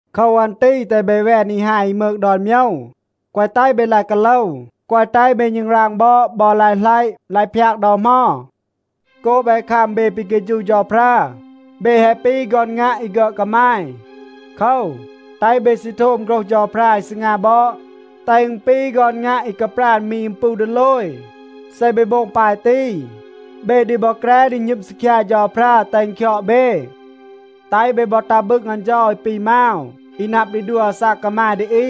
โคว อัน ตี แตห เบ แวน อี ฮาย อี มืก ดอน โมยว. แกวะ แตห เบ กาโลว, แกวะ แตห เบ ณึงราง บอด บอ ลาย หลัยะ, ลาย พยาก ดอ เหมา. โกบ แฮะ คัม เบ ปี เฆฌู เฌาพรา, เบ แฮะ ปี ฆอน งัะ อี ฆึอด กามาย. โคว, แตห เบ ซี โทม โฆรห เฌาพรา อี ซีงา บอด, แตห อึณ ปี ฆอน งัะ อี กาปราณ มี อึม ปู ดีโลย. เซ เบ โบง ปาย ตี, เบ ดี บอ แกร ดี หณึม ซีคยา เฌาพรา, แตห อึณ คยอด เบ. แตห เบ บอ ตัห บึง อัน เฌา อี ปี มาว อี นับ ดี ดัว อาซาก กามาย ดี อี.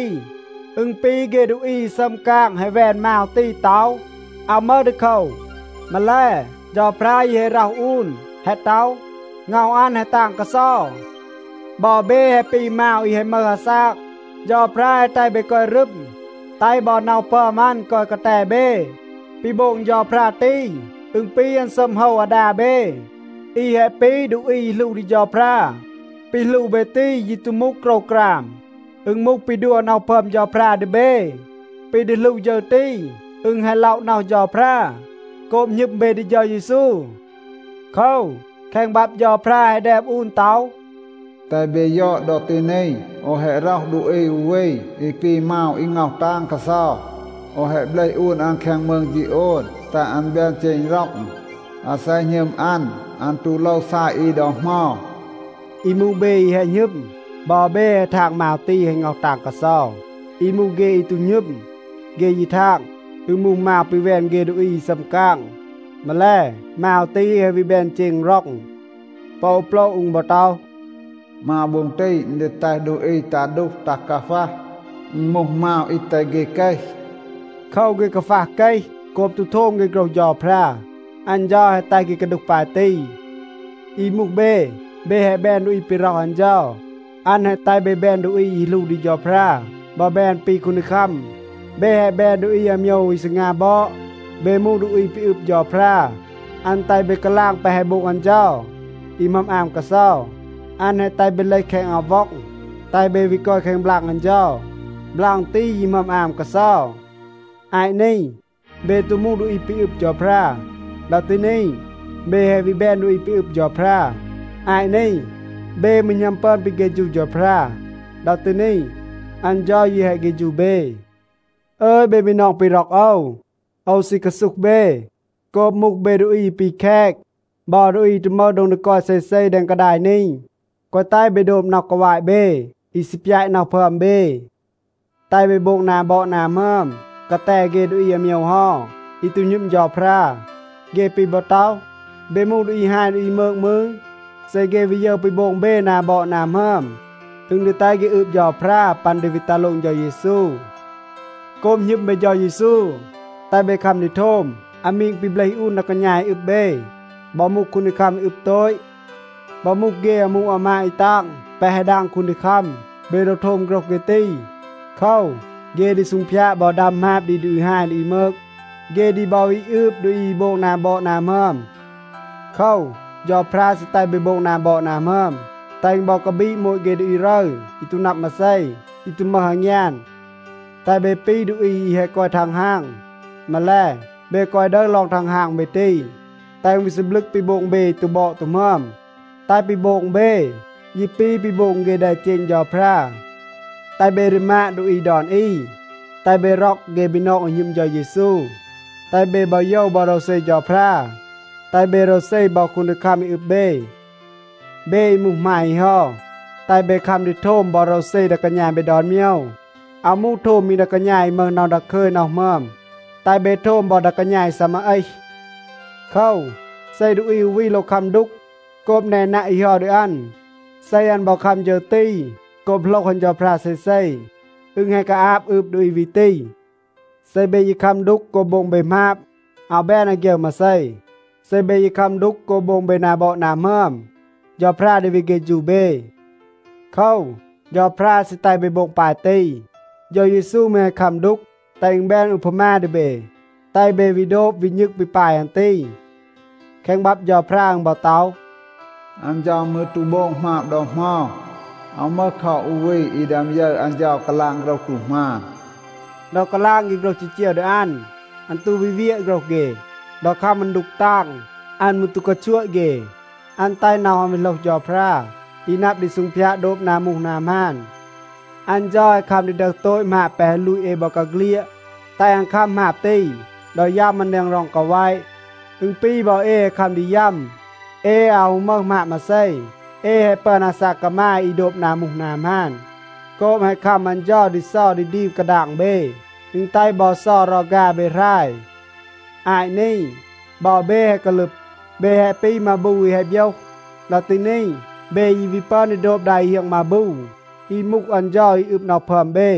อึณ ปี เฆ ดูอี อี ซัม กาง แฮะ แวน มาว ตี ต็อห, อาว มึห ดีโคว. มาแล, เฌาพรา ยี แฮะ ร็อห อูน, แฮะ ต็อห, ง็อห อัน แฮะ ตาง กาเซา. บอ เบ แฮะ ปี มาว อี แฮะ มึห อาซาก. เฌาพรา แฮะ แตห เบ กอย รึม, แตห บอ น็อห พึอม อัน กอย กาแต เบ. ปี โบง เฌาพรา ตี, อึณ ปี อัน ซัม โฮว อาดา เบ อี แฮะ ปี ดูอี อี หลู ดี เฌาพรา. ปี หลู เบ ตี ยี ตู มูห โกรวกราม. อึณ มูห ปี ดัว น็อห พึอม เฌาพรา ดี เบ. ปี ดี หลู ฌึร ตี, อึณ แฮะ ล็อะ น็อห เฌาพรา โกบ หณึม เบ ดี เฌา เยซู. โคว, แคง บับ เฌาพรา แฮะ แดม อูน ต็อห, “แตห เบ ยอด ดอ ตี นี, โอว แฮะ ร็อห ดูอี อู วี อี ปี มาว อี ง็อห ตาง กาเซา. โอว แฮะ เบลห อูน อัน แคง มืง ฌีโอน, แตห อัน แบน เจณ ร็อง. อาเซ หณึม อัน, อัน ตู โลว ซาย อี ดอ เหมา.” อี มูห เบ อี แฮะ หณึม, บอ เบ แฮะ ทาง มาว ตี แฮะ ง็อห ตาง กาเซา. อี มูห เฆ อี ตู หณึม, เฆ ยี ทาง, อึณ มูห มาว ปี แวน เฆ ดูอี อี ซัม กาง. มาแล, มาว ตี แฮะ วี แบน เจณ ร็อง. ปอ อู โปละ อึณ บอ ต็อห, “มาว โบ็ง ตี, อึณ ดี แตห ดูอี ตัห ดูห, ตัห กาฟัห. อึณ มูห มาว อี แตห เฆ เกห.” โคว, เฆ กาฟัห เกห โกบ ตู โทม เฆ โฆรห เฌาพรา. อัน เฌา แฮะ แตห เฆ กาดูห ปาย ตี. อี มูห เบ, เบ แฮะ แบน ดูอี ปี ร็อห อัน เฌา. อัน แฮะ แตห เบ แบน ดูอี อี หลู ดี เฌาพรา บอ แบน ปี คูนดีคัม. เบ แฮะ แบน ดูอี อาโมยว อี ซีงา บอด. เบ มูห ดูอี ปี อึบ เฌาพรา. อัน แตห เบ กาลาง แปะ แฮะ โบง อัน เฌา อี หมึอม อาม กาเซา. อัน แฮะ แตห เบ เลห แคง อับ ว็อง, แตห เบ วี กอย แคง บลาง อัน เฌา. บลาง ตี ยี หมึอม อาม กาเซา. อาต นี, เบ ตู มูห ดูอี ปี อึบ เฌาพรา. ดอ ตี นี, เบ แฮะ วี แบน ดูอี ปี อึบ เฌาพรา. อาต นี เบ มืร หณัม ปึอน ปี เฆฌู เฌาพรา. ดอ ตี นี, อัน เฌา ยี แฮะ เฆฌู เบ. อึย เบ บีนอง ปี ร็อก โอว, โอว ซี กาซูห เบ. โกบ มูห เบ ดูอี อี ปี แคต บอ ดูอี อี ตู มึห โดง ดี กอย เซเซ แดง กาดาย นี, แกวะ แตห เบ โดบ น็อห กาวาต เบ อี ซี ปยาต น็อห พึอม เบ. แตห เบ โบง นา บอด นา หมึอม กาแต เฆ ดูอี อาโมยว เฮา อี ตู หณึม เฌาพรา. เฆ ปี บอ ต็อห, เบ มูห ดูอี ฮาย ดูอี มืก มืร, เซ เฆ วี ยึร ปี โบง เบ นา บอด นา หมึอม, อึณ ดี แตห เฆ อืบ เฌาพรา ปัน ดี วี ตัห โลง เฌา เยซู. โกบ หณึม เบ เฌา เยซู, แตห เบ คัม ดี โทม อามีง ปี เบลห อูน ดา กาณา อี อึบ เบ. บอ มูห คูนดีคัม อี อึบ โตต, บอ มูห เฆ อามู อามาด อี ตาง แปะ แฮะ ดาง คูนดีคัม, เบ โลว โทม โฆรห เฆ ตี. โคว, เฆ ดี ซูงพยาด บอ ดัม หมาบ ดี ดูอี ฮาย ดูอี มืก. เฆ ดี บอ วี อืบ ดูอี อี โบง นา บอด นา หมึอม. โคว, เฌาพรา ซี แตห เบ โบง นา บอด นา หมึอม, แตห อึณ บอ กาบีด โมต เฆ ดูอี รึร อี ตู นับ มาเซ, อี ตู มึห อางยาน. แตห เบ ปี ดูอี อี แฮะ กอย ทังฮาง. มาแล, เบ แกวะ ดึห ลอง ทังฮาง เบ ตี, แตห อึณ วี ซีบลึก ปี โบง เบ อี ตู บอด ตู หมึอม. แตห ปี โบง เบ ยี ปี ปี โบง เฆ แดเจณ เฌาพรา. แตห เบ รีมาด ดูอี ดอน อี. แตห เบ ร็อก เฆ บีนอง อี หณึม เฌา เยซู, แตห เบ บอ โยว บอ โรวเซ เฌาพรา. แตห เบ โรวเซ บอ คูนดีคัม อี อึบ เบ. เบ อี มูห หมาย อี เฮา, แตห เบ คัม ดี โทม บอ โรวเซ ดา กาณา เบ ดอน โมยว. อาว มูห โทม มี ดา กาณา อี มึห น็อห ดาคึย น็อห หมึอม. แตห เบ โทม บอ ดา กาณา อี ซีมา เอห. โคว, เซ ดูอี อู วี โลว คัม ดูก โกบ แนนัะ อี เฮา ดี อัน, เซ อัน บอ คัม ฌึร ตี โกบ โหลห อัน เฌาพรา เซเซ, อึณ แฮะ กาอาบ อืบ ดูอี วี ตี. เซ เบ ยี คัม ดูก โกบ โบง เบ หมาบ, อาว แบน อาฆยึร มาเซ. เซ เบ ยี คัม ดูก โกบ โบง เบ นา บอด นา หมึอม, เฌาพรา ดี วี เฆฌู เบ. โคว, เฌาพรา ซี แตห เบ โบง ปาย ตี. เฌา เยซู มืร แฮะ คัม ดูก, แตห อึณ แบน อูพามา ดี เบ, แตห เบ วี โดบ วี ณึง ปี ปาย อัน ตี. แคง บับ เฌาพรา อึณ บอ ต็อห, “อัน เฌา มืร ตู โบง หมาบ ดอ เหมา. อาว มึห คอ อู วี อี ดึอม ยึร อัน เฌา กาลาง โฆรห ตู หมาน.” ดอ กาลาง เฆ โฆรห จีจีว ดี อัน, อัน ตู วี เวียะ โฆรห เฆ. ดอ คัม อัน ดูก ตาง, อัน มืร ตู กาชัวะ เฆ. อัน แตห น็อห อัน วี โหลห เฌาพรา อี นับ ดี ซูงพยาด โดบ นา มูห นา หมาน. อัน เฌา แฮะ คัม ดี ดึห โตต หมาบ แปะ แฮะ ลูต เอ บอกาเฆลียด, แตห อัน คัม หมาบ ตี ดอ ยัม อัน แดง ร็อง กาแวะ. อึณ ปี บอ เอ แฮะ คัม ดี ยัม. เอ อาว ฮู มึห หมาบ มาเซ. เอ แฮะ ปึอน อาซาก กามาย อี โดบ นา มูห นา หมาน. โกบ แฮะ คัม อัน เฌา ดี เซา ดี ดีม กาดาง เบ, อึณ แตห บอ เซา รอฆา เบ หราย. อาต นี บอ เบ แฮะ กาลึบ. เบ แฮะ ปี มาบู อี แฮะ โบยห. ดอ ตี นี, เบ ยี วี ปึอน ดี โดบ ดา อี เฮียง มาบู อี มูห อัน เฌา อี อึบ น็อห พึอม เบ.